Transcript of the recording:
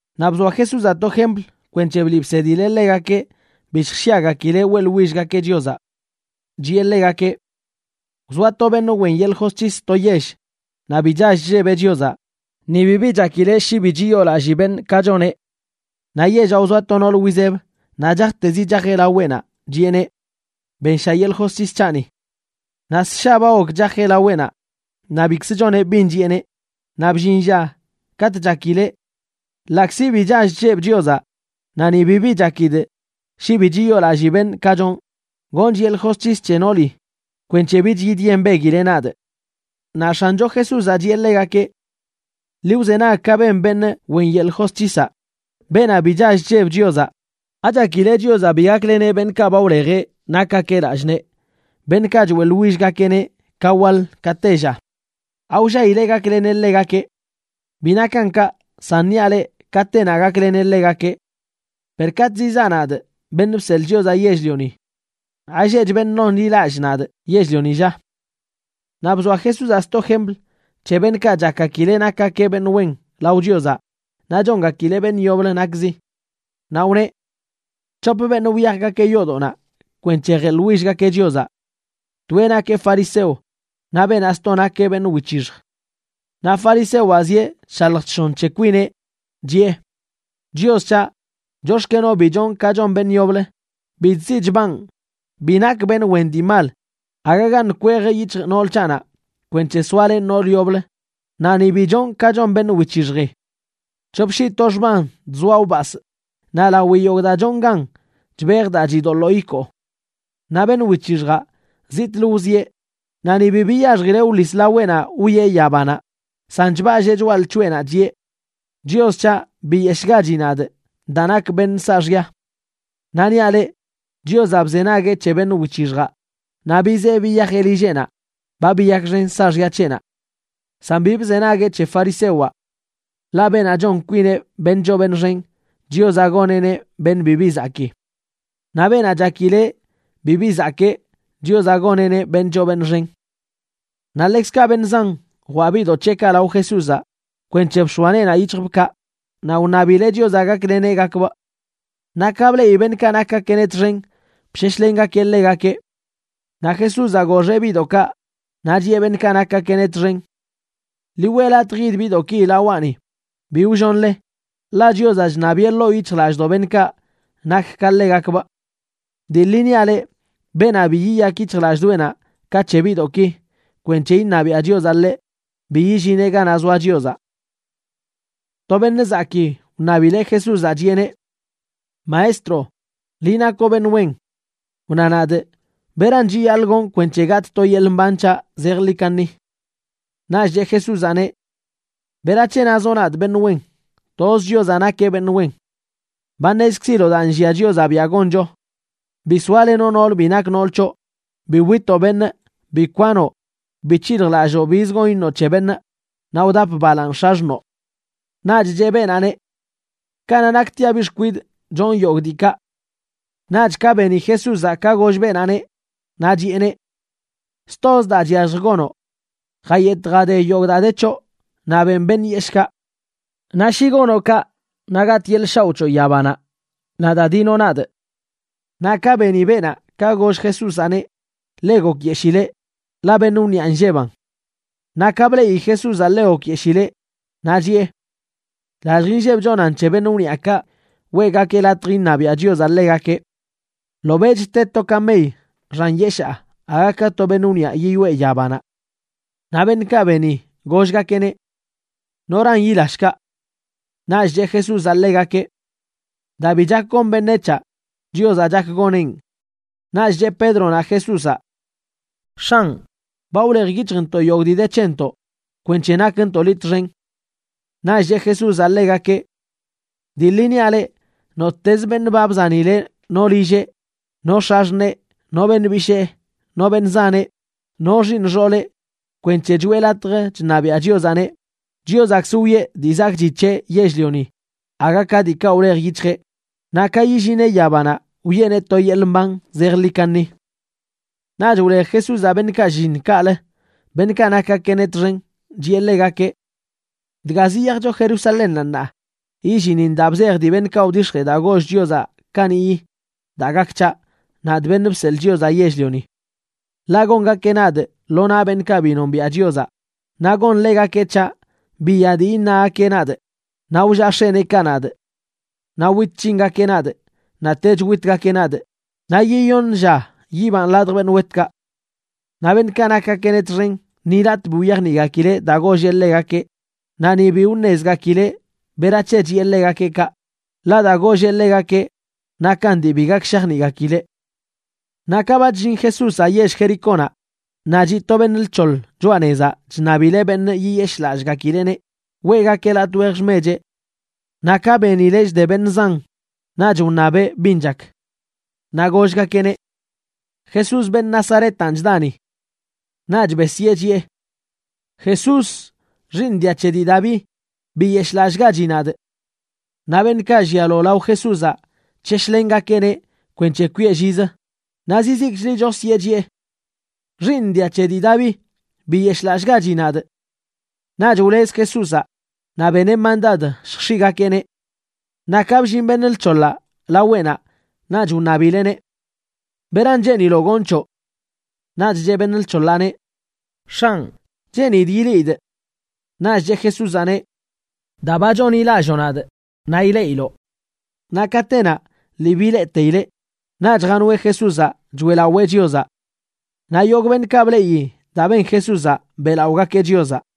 Naꞌ bzoa Jesúzaꞌ to jempl kwenc̱he bliꞌ bsedileꞌ ḻegakeꞌ bi lljshyagakileꞌ weꞌḻwillgakeꞌ Chiozaꞌ. Chiꞌe ḻegakeꞌ: ―Wzoa to beṉꞌ wen yeḻꞌ josc̱his to yell, naꞌ bi chall chllebeꞌ Chiozaꞌ, ni bibi chakileꞌ shi bi chiyoolallii beṉꞌ ka choneꞌ. Naꞌ yellaꞌ wzoa to noolə wizeb naꞌ chajtezi chajeꞌ laweꞌnaꞌ, chiꞌeneꞌ: “Bensha yeḻꞌ josc̱his c̱haꞌni.” Naꞌ ssha ba gok chajeꞌ laweꞌnaꞌ naꞌ bikzə choneꞌ bin chiꞌeneꞌ, naꞌ bllin lla katꞌ chakileꞌ: “Ḻaꞌkzi bi chall chllebꞌ Chiozaꞌ naꞌ ni bibi chakidꞌ shi bi chiyoolallii beṉꞌ ka chonꞌ, gonchꞌ yeḻꞌ josc̱his c̱he nooli kwenc̱he bich yidyembeguileꞌ nadꞌ.” Naꞌ X̱ancho Jesúzaꞌ chiꞌe ḻegakeꞌ: ―Ḻi wzenag ka ben beṉꞌ wen yeḻꞌ josc̱hisaꞌ, beenaꞌ bi chall chlleb Chiozaꞌ. ¿Achakile Chiozaꞌ bi gakleneꞌ beṉꞌkaꞌ ba wlejeꞌ nakgakeꞌ lallꞌ nee, beṉꞌkaꞌ choeꞌḻwillgakeꞌneꞌ ka waḻ ka tella? ¿Awllaileꞌ gakleneꞌ ḻegakeꞌ? Bi nakan kaꞌ, san niaꞌ leꞌ katenaꞌ gakleneꞌ ḻegakeꞌ. Per katꞌ zizaa, nadꞌ, Beṉꞌ Bseḻꞌ Chiozaꞌ Yell-lioni, ¿alleꞌch beṉꞌ nonḻilallꞌ nadꞌ yell-lioni, lla? Naꞌ bzoa Jesúzaꞌ sto jempl c̱he beṉꞌkaꞌ chakgakileꞌ nakgakeꞌ beṉꞌ wen lao Chiozaꞌ naꞌ chongakileꞌ beṉꞌ yoblə nakzi. Naꞌ wneꞌ: ―C̱hop beṉꞌ wyajgakeꞌ yoodoꞌnaꞌ kwenc̱he jeꞌḻwillgakeꞌ Chiozaꞌ. Toeꞌ nakeꞌ fariseo naꞌ beenaꞌ sto nakeꞌ beṉꞌ wic̱hixj. Naꞌ farisewaꞌ zieꞌ chshalj chshon c̱he kwineꞌ, chiꞌe: “Chios c̱haꞌ, chox̱kenoꞌ bi chonꞌ ka chon beṉꞌ yoblə, bi chziꞌ chbanꞌ, bi nakꞌ beṉꞌ wen dii mal, agagaṉꞌ kwej yic̱hjꞌ nool c̱haꞌnaꞌ kwenc̱he soalenꞌ nool yoblə, naꞌ ni bi chonꞌ ka chon beṉꞌ wic̱hixji. C̱hop shii to xman chzoaꞌ wbasꞌ, naꞌ lawi yogꞌ daa chonꞌ gan chbejꞌ daa chidoḻoo ikoo.”a Naꞌ beṉꞌ wic̱hixjaꞌ, zitꞌlə wzieꞌ naꞌ ni bi biyaxjileꞌ wḻis laweꞌnaꞌ wwieꞌ yabanaꞌ, san chballee choꞌa lc̱hoꞌenaꞌ chiꞌe: “¡Chios c̱haꞌ, biyeshꞌgachi nadꞌ daa nakꞌ beṉꞌ saaxya!” Naꞌ niaꞌ leꞌ, Chiozaꞌ bzenagueꞌ c̱he beṉꞌ wic̱hixjaꞌ naꞌ bizee biyajeꞌ lilleꞌnaꞌ ba biyakxen saaxya c̱heꞌnaꞌ. San bi bzenagueꞌ c̱he farisewaꞌ. Ḻaꞌ beenaꞌ chon kwineꞌ beṉꞌ choo beṉꞌ xen, Chiozaꞌ goneꞌneꞌ beṉꞌ bibi zakii. Naꞌ beenaꞌ chakileꞌ bibi zakee, Chiozaꞌ goneꞌneꞌ beṉꞌ choo beṉꞌ xen. Naꞌ ḻekzkaꞌ beṉꞌ zan jwaꞌ biꞌdoꞌ c̱heꞌkaꞌ lao Jesúzaꞌ kwenc̱he bx̱oa neenaꞌ yic̱hjbꞌkaꞌ naꞌ wṉabileꞌ Chiozaꞌ gakleneꞌgakbꞌ. Naꞌ ka bleꞌi beṉꞌkaꞌ nakgakeꞌneꞌ txen, bsheshlengakeꞌ ḻegakeꞌ. Naꞌ Jesúzaꞌ goxeꞌ biꞌdoꞌkaꞌ, naꞌ chiꞌe beṉꞌkaꞌ nakgakeꞌneꞌ txen: ―Ḻi weꞌ latj yid biꞌdoꞌki lawaꞌni, bi wllonle, ḻaꞌ Chiozaꞌ chṉabiꞌe ḻoo yic̱hjlallꞌdoꞌ beṉꞌkaꞌ nak ka ḻegakbꞌ. Dii ḻi niaꞌ leꞌ, beenaꞌ bi yiyak yic̱hjlallꞌdoꞌenaꞌ ka c̱he biꞌdoꞌki kwenc̱he iṉabiaꞌ Chiozaꞌ ḻeꞌ, bi yillineꞌ ganaꞌ zoa Chiozaꞌ. To beṉꞌ zakii wṉabileꞌ Jesúzaꞌ, chiꞌeneꞌ: ―Maestro, liꞌ nakoꞌ beṉꞌ wen. Wna nadꞌ beran chiyaḻꞌ gonꞌ kwenc̱he gatꞌ to yeḻꞌ mban c̱haꞌ zejḻi kaṉi. Naꞌch cheꞌ Jesúzaꞌneꞌ: ―¿Berac̱he nazoꞌ nadꞌ beṉꞌ wen? Toz Chiozaꞌ nakeꞌ beṉꞌ wen. Ba ṉezkziloꞌ daa nllia Chiozaꞌ biaꞌ goncho: “Bi soalenoꞌ nool bi nak nool c̱hoꞌ, bi witoꞌ beṉꞌ, bi kwanoꞌ, bi c̱hiljlalloo bizə gon iṉoꞌ c̱he beṉꞌ, naꞌ wdap balaaṉ x̱axṉoo.” Naꞌch cheꞌ beenaꞌneꞌ: ― Kanaꞌ naktiaꞌ biꞌ xkwidꞌ chonꞌ yogꞌ diikaꞌ. Naꞌch ka beni Jesúzaꞌ ka goll beenaꞌneꞌ, naꞌ chiꞌeneꞌ: ―Stozə daa chyallj gonoꞌ: jayetꞌ jade yogꞌ daa de c̱hoꞌ naꞌ beꞌn beṉꞌ yeshꞌkaꞌ. Naꞌ shi gonoꞌ kaꞌ, naꞌ gatꞌ to yeḻꞌ shaoꞌ c̱hoꞌ yabanaꞌ. Naꞌ da, dinoꞌ nadꞌ. Naꞌ ka beni beenaꞌ ka goll Jesúzaꞌneꞌ, ḻe gokyeshileꞌ, ḻaꞌ beṉꞌ wniꞌa nllebanꞌ. Naꞌ ka bleꞌi Jesúzaꞌ ḻe gokyeshileꞌ, naꞌ chiꞌe: ―¡Lallj inlleb chonan c̱he beṉꞌ wniꞌakaꞌ weꞌgakeꞌ latj iṉabiaꞌ Chiozaꞌ ḻegakeꞌ! Ḻobeꞌch te to kamey xan yeshaa aga ka to beṉꞌ wniꞌa yiyoꞌe yabanaꞌ. Naꞌ beṉꞌkaꞌ beni, gollgakeꞌneꞌ: ―¿Noran yila shkaꞌ? Naꞌch cheꞌ Jesúzaꞌ ḻegakeꞌ: ―Daa bi chak gon beṉec̱haꞌ, Chiozaꞌ chak goneꞌn. Naꞌch cheꞌ Pédronaꞌ Jesúzaꞌ: ―X̱anꞌ, ba wlej yic̱hjntoꞌ yogꞌ dii de c̱hentoꞌ kwenc̱he nakntoꞌ liꞌ txen. Naꞌch cheꞌ Jesúzaꞌ ḻegakeꞌ: ―Dii ḻi niaꞌ leꞌ, nottezə beṉꞌ ba bzanileꞌ no lilleꞌ, no x̱axṉee, no beṉꞌ bishee, no beṉꞌ zaneꞌ, no xiiṉ xooleꞌ kwenc̱he choꞌe latj chṉabiaꞌ Chiozaꞌneꞌ, Chiozaꞌkzə wiꞌe dii zakꞌchi c̱heꞌ yell-lioni aga ka diikaꞌ wlej yic̱hjeꞌ, naꞌ ka yillineꞌ yabanaꞌ wiꞌeneꞌ to yeḻꞌ mban zejḻi kaṉi. Naꞌch wlej Jesúzaꞌ beṉꞌkaꞌ shlliṉ kaꞌlə, beṉꞌkaꞌ nakgakeꞌneꞌ txen, chiꞌe ḻegakeꞌ: ―Dga ziyajcho Jerusalénnaꞌ ṉaa, yillinin daa bzej dii beṉꞌkaꞌ wdix̱jee daa goll Chiozaꞌ kaniꞌyi daa gak c̱haꞌ, nadꞌ, Beṉꞌ Bseḻꞌ Chiozaꞌ Yell-lioni. Ḻaꞌ gongakeꞌ nadꞌ lo naꞌ beṉꞌkaꞌ bi nombiaꞌ Chiozaꞌ, naꞌ gonḻegakeꞌ c̱haꞌ, biya dii iṉagakeꞌ nadꞌ, naꞌ wllaꞌ x̱eneekaꞌ nadꞌ. Naꞌ wit c̱hingakeꞌ nadꞌ naꞌtech witgakeꞌ nadꞌ, naꞌ yiyoṉ lla yibanꞌ ladj beṉꞌ wetkaꞌ. Naꞌ beṉꞌkaꞌ nakgakeꞌneꞌ txen ni latꞌ bi wyajniꞌgakileꞌ daa golleꞌ ḻegakeꞌ, naꞌ ni bi wṉezgakileꞌ berac̱he chiꞌe ḻegakeꞌ kaꞌ, ḻaꞌ daa golleꞌ ḻegakeꞌ nakan dii bi gak shajniꞌgakileꞌ. Naꞌ ka ba chllin Jesúzaꞌ yell Jericónaꞌ, naꞌ chiꞌ to beṉꞌ lc̱hoḻ choꞌa nezaꞌ chṉabileꞌ beṉꞌ yiyeshꞌlallꞌgakileꞌneꞌ weꞌgakeꞌ latꞌ wej xmecheꞌ. Naꞌ ka benileꞌ chde beṉꞌ zan naꞌch wṉabeꞌ bin chak. Naꞌ gollgakeꞌneꞌ: ―Jesús, beṉꞌ Nazaretanꞌ, chda ni. Naꞌch besyee, chiꞌe: ―¡Jesús, Xiiṉ dia c̱he dii Daví, biyeshꞌlallꞌgachi nadꞌ! Naꞌ beṉꞌkaꞌ llialo lao Jesúzaꞌ chsheshlengakeꞌneꞌ kwenc̱he kwiꞌe llizə, naꞌ zizikchlə chosyee, chiꞌe: ―¡Xiiṉ dia c̱he dii Daví, biyeshꞌlallꞌgachi nadꞌ! Naꞌch wlez Jesúzaꞌ naꞌ beneꞌ mandad lljx̱iꞌgakeꞌneꞌ. Naꞌ ka bllin beṉꞌ lc̱hoḻaꞌ laweꞌnaꞌ naꞌch wṉabileꞌneꞌ: ―¿Beran cheeniloꞌ gonꞌ c̱hoꞌ? Naꞌch cheꞌ beṉꞌ lc̱hoḻaꞌneꞌ: ―X̱anꞌ, cheenidꞌ ileꞌidꞌ. Naꞌch cheꞌ Jesúzaꞌneꞌ: ―Daa ba chonḻilalloo nadꞌ naꞌ ileꞌiloꞌ. Naꞌ katenaꞌ lii bileꞌteileꞌ, naꞌch janoeꞌ Jesúzaꞌ choeꞌlawee Chiozaꞌ. Naꞌ yogꞌ beṉꞌkaꞌ bleꞌi daa ben Jesúzaꞌ beꞌlaꞌogakeꞌ Chiozaꞌ.